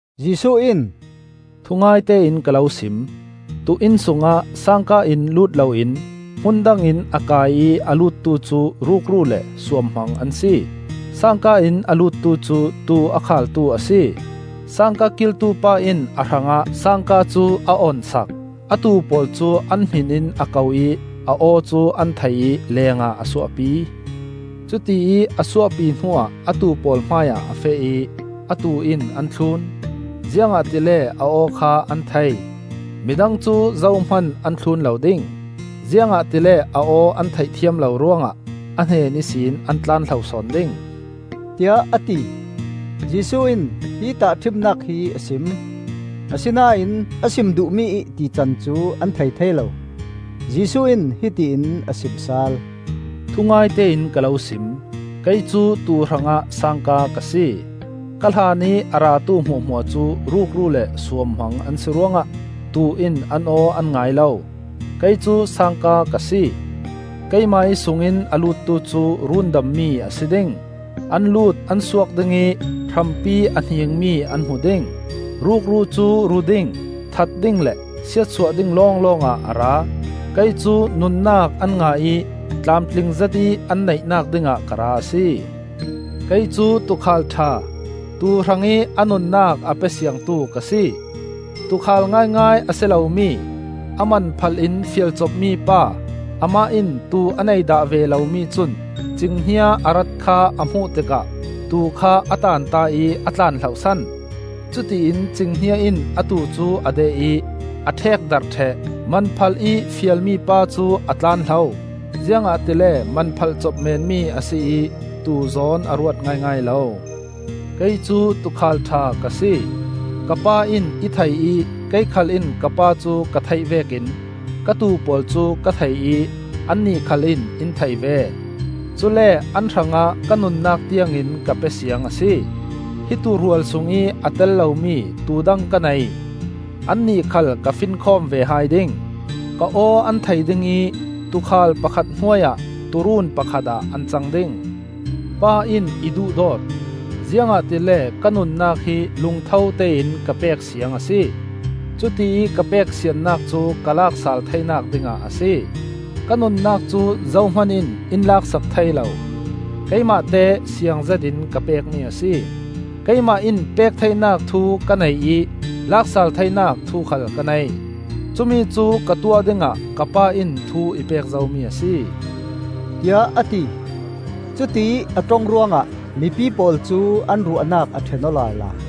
Jesuh in, “Thungaite in ka lo sim: tuu inn sungah sangka in lut loin hmun dang in a kai ih a luttu cu rukru le suamhmang an si. sangka in a luttu cu tuu a khaaltu a si. sangka kiltu pa in a hrangah sangka cu a on sak. A tuu pawl cu an hminin a ko ih a aw cu an thei ih lengah a suahpi. Cutiih a suahpi hnuah a tuu pawl hmaiah a feh ih a tuu in an thlun; ziangahtile a aw kha an thei. Midang cu zohman an thlun lo ding; ziangahtile a aw an theih thiam lo ruangah a hnen ihsin an tlan hlo sawn ding,” tiah a ti. Jesuh in hi tahṭhimnak hi a sim, asinain a sim duhmi ih tican cu an thei thei lo. Jesuh in hiti in a sim sal, “Thungaite in ka lo sim: Kei cu tuu hrangah sangka ka si. Ka hlan ih a ratu hmuahhmuah cu rukru le suamhmang an si ruangah tuu in an aw an ngai lo. Kei cu sangka ka si. Keimah ih sungin a luttu cu rundammi a si ding. An lut an suak ding ih hrampi a hningmi an hmu ding. Rukru cu ru ding, that ding le siatsuah ding lawnglawngah a ra. Kei cu nunnak an ngah ih tlamtling zetih an neihnak dingah ka ra a si. Kei cu tuukhal ṭha, tuu hrangih a nunnak a pe siangtu ka si. Tuukhal ngaingai a si lomi, a man phalh in fialcop mipa, amah in tuu a nei dah ve lomi cun cinghnia a rat kha a hmuh tikah tuu kha a tanta ih a tlan hlohsan. Cutiin cinghnia in a tuu cu a deh ih a ṭhekdarh ṭheh. Manphalh ih fial mipa cu a tlan hlo, ziangahtile man phalhcop menmi a si ih tuu zawn a ruat ngaingai lo. Kei cu tuukhal ṭha ka si. Ka Pa in i thei ih kei khal in ka Pa cu ka theih vekin ka tuu pawl cu ka thei ih annih khal in in thei ve. Cule an hrangah ka nunnak tiangin ka pe siang a si. Hi tuurual sungih a tel lomi tuu dang ka nei. Annih khal ka finkhawm ve hai ding. Ka aw an thei ding ih tuukhal pakhat hnuai-ah tuuruun pakhat ah an cang ding! Pa in i duhdawt, ziangahtile ka nunnak hi lungtho tein ka pek siang a si; cutiih ka pek siannak cu ka lak sal theinak dingah a si. Ka nunnak cu zohman in in lak sak thei lo. Keimahte siang zetin ka pekmi a si. Keimah in pek theinak thu ka nei ih lak sal theinak thu khal ka nei. Cumi cu ka tuah dingah ka Pa in thu i pek zomi a si,” tiah a ti. Cutiih a ṭong ruangah mipi pawl cu an ruahnak a ṭhen aw lala.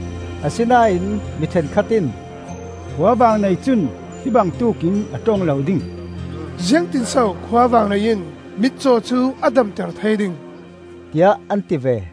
Asinain mi ṭhenkhat in, “Khuavang nei cun hi bangtuk in a ṭong lo ding! Ziangtin so khuavang nei in mitcaw cu a damter thei ding?” tiah an ti ve.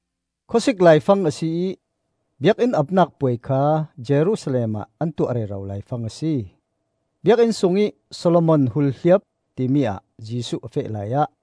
Khawsik laifang a si ih Biakinn Apnak Puai kha Jerusalem ah an tuah rero laifang a si. Biakinn sungih Solomon Hulhliap timi ah Jesuh a feh laiah,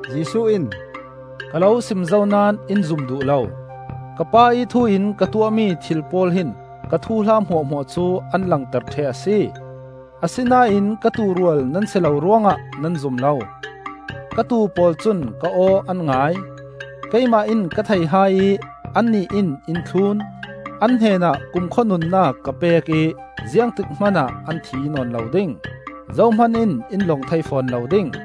Jesuh in, “Ka lo sim zo naón in zum duh lo. Ka Pa ih thu in ka tuahmi thil pawl hin ka thuhla hmuahhmuah cu an langter ṭheh a si. Asinain ka tuurual nan si lo ruangah nan zum lo. Ka tuu pawl cun ka aw an ngai; keimah in ka thei hai ih annih in in thlun. An hnenah kumkhua nunnak ka pek ih ziangtik hmanah an thi nawn lo ding. Zohman in in lawng thei fawn lo ding.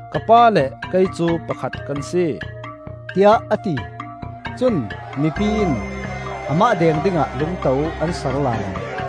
Ka Pa le keimah cu pakhat kan si,” tiah a ti. Cun mipi in amah deng dingah lungto an sar lala.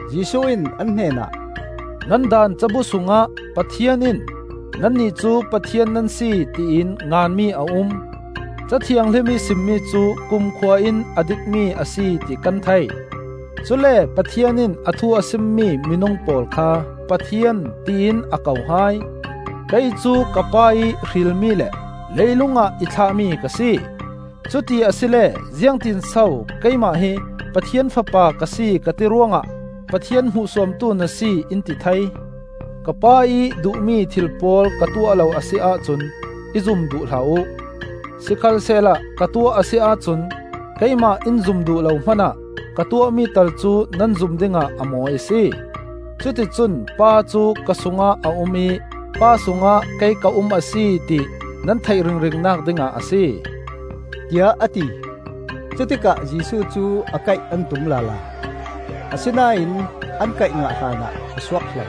Jesuh in an hnen ah, “Nan Daan cabu sungah Pathian in ‘Nannih cu pathian nan si,’ ti in nganmi a um. Ca Thianghlim ih simmi cu kumkhua in a dikmi a si ti kan thei; cule Pathian in a thu a simmi minung pawl kha ‘pathian,’ tiin a ko hai. Kei cu ka Pa ih hrilmi le leilung ah i thlahmi ka si. Cuti asile ziangtinso keimah hi Pathian Fapa ka si ka ti ruangah Pathian hmuhsuamtu na si, in ti thei? Ka Pa ih duhmi thil pawl ka tuah lo a si ahcun i zum duh hlah uh! Sikhalsehla ka tuah a si ahcun keimah in zum duh lo hmanah ka tuahmi tal cu nan zum dingah a mawi a si; cuticun Pa cu ka sungah a um ih Pa sungah kei ka um a si, ti nan theih ringringnak dingah a si,” tiah a ti. Cutikah Jesuh cu a kaih an tum lala, asinain an kaih ngah hlanah a suak hlo.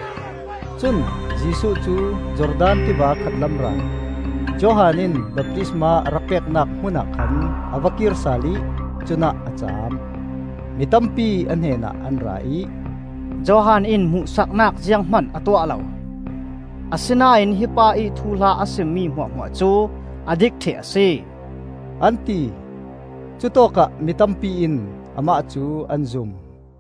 Cun Jesuh cu Jordan tiva khatlam ral, Johan in baptisma a rak peknak hmunah khan a va kir sal ih cunah a caam. Mi tampi a hnenah an ra ih, “Johan in hmuhsaknak zianghman a tuah lo. Asinain hi pa ih thuhla a simmi hmuahhmuah cu a dik ṭheh a si,” an ti. Cutawkah mi tampi in amah cu an zum.